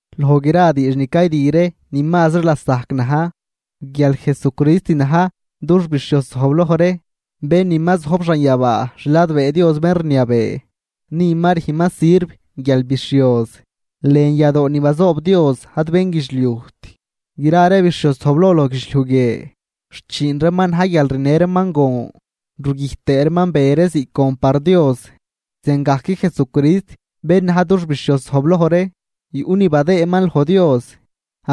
Loj gra diidx ni caydü ree ni mazri lasajc na̱j guial Jesucrist na̱j dux bixhioz zojbloj ree, bén ni ma zojb xanyabaa xladbee Dios bén rniabee. Ni ma rüjnman sirv guialbixhioz, lën yadoo ni bazoob Dios, ad bénguidxliujt. Gra ree bixhioz zojbloj loj guidxliuj guie xchiin reeman na̱j guial rinë reeman gon rugüjt tëë reeman be ree ziꞌc gon par Dios. Ziangajc Jesucrist bén na̱j dux bixhioz zojbloj ree yuꞌ ni badëëman loj Dios.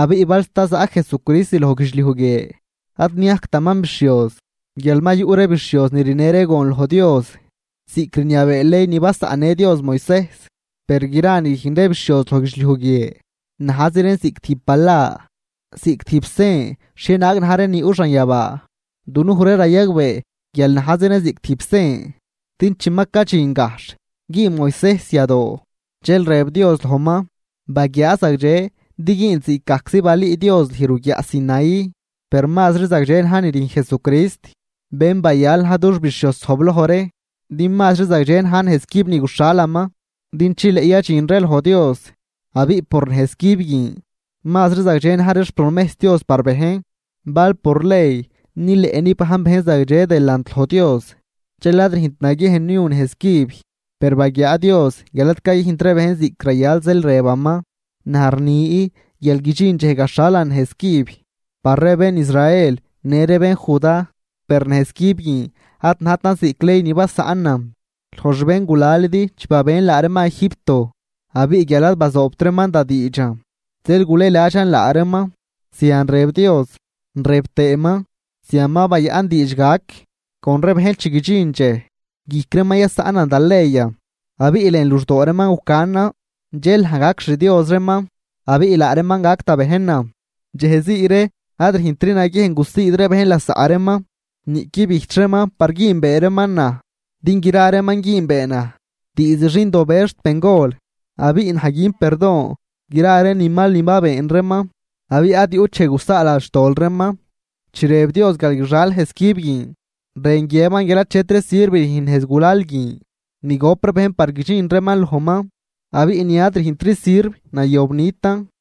Abiꞌ bal sta zaꞌ Jesucrist loj guidxliuj guie ad niajctaman bixhioz, guial ma yuꞌ ree bixhioz ni rinë ree gon loj Dios ziꞌc rniabee ley ni basaꞌnnë Dios Moisejs. Per gra ni rüjn ree bixhioz loj guidxliuj guie, najzi reen ziꞌc tijb bala, ziꞌc tijb sen xhienaag na̱j ree ni yuꞌ xanyabaa. Dunuj ree rayagbee guial najzi reen ziꞌc tijb sen din chi ma cadxin gajxh güün Moisejs yadoo, dxel rëb Dios lojman: “Baguiaa zagdxe din güünl ziꞌcgajczi balün lüj ruguiaꞌ Sinaí.” Per mazri zagdxe na̱j ni rüjn Jesucrist, bén bayal na̱j dux bixhioz zojbloj ree, din mazri zagdxe na̱j nejz cüb ni guxhalaman din chileꞌ yadxin ree loj Dios. Abiꞌ por nejz cüb guin mazri zagdxe na̱j ree xpromejs Dios par bejn. Bal por ley nileꞌ nibajn bejn zagdxe delant loj Dios, dxel ad rüjnt naguiejn niu nejz cüb. Per baguiaa Dios guial ad cayüjnt ree bejn ziꞌc rayal zeel rëbaman: Naj rni guial guidxin dxej gaxhalan nejz cüb par ree bén Israel në ree bén Judá. Per nejz cüb guin ad najtan ziꞌc ley ni basaꞌnan loj xbéngulalidi chi babën laa reeman Egipto. Abiꞌ guial ad bazoobt reeman da diidxan zeel gulëladxan laa reeman, zian rëb Dios. Rëb tëëman: Zian ma bayaꞌn diidx gac con ree bejn chi guidxin dxej guijc reeman yasaꞌnan da leyan abiꞌ lën luxdoo reeman gucanan. Dxel naj gac xDios reeman, abiꞌ laa reeman gac da bejnan. Dxejzii ree ad rüjntri naguiejn gusiid ree bejn lasaꞌ reeman. Niꞌqui bijch reeman par güünbee reeman naj, din gra reeman güünbee naj, diizd xindobëz xt bengol. Abiꞌ naj gün perdon gra ree ni mal ni ma been reeman, abiꞌ ad yuꞌt dxej gusaaladxan xtol reeman. Chi rëb Dios guial guixal nejz cüb guin rën guiëban guial achetri sirv rüjn nejz gulal guin ni gop ree bejn par guidxin reeman lojman, abiꞌ ni ad rüjntri sirv nayob nitan.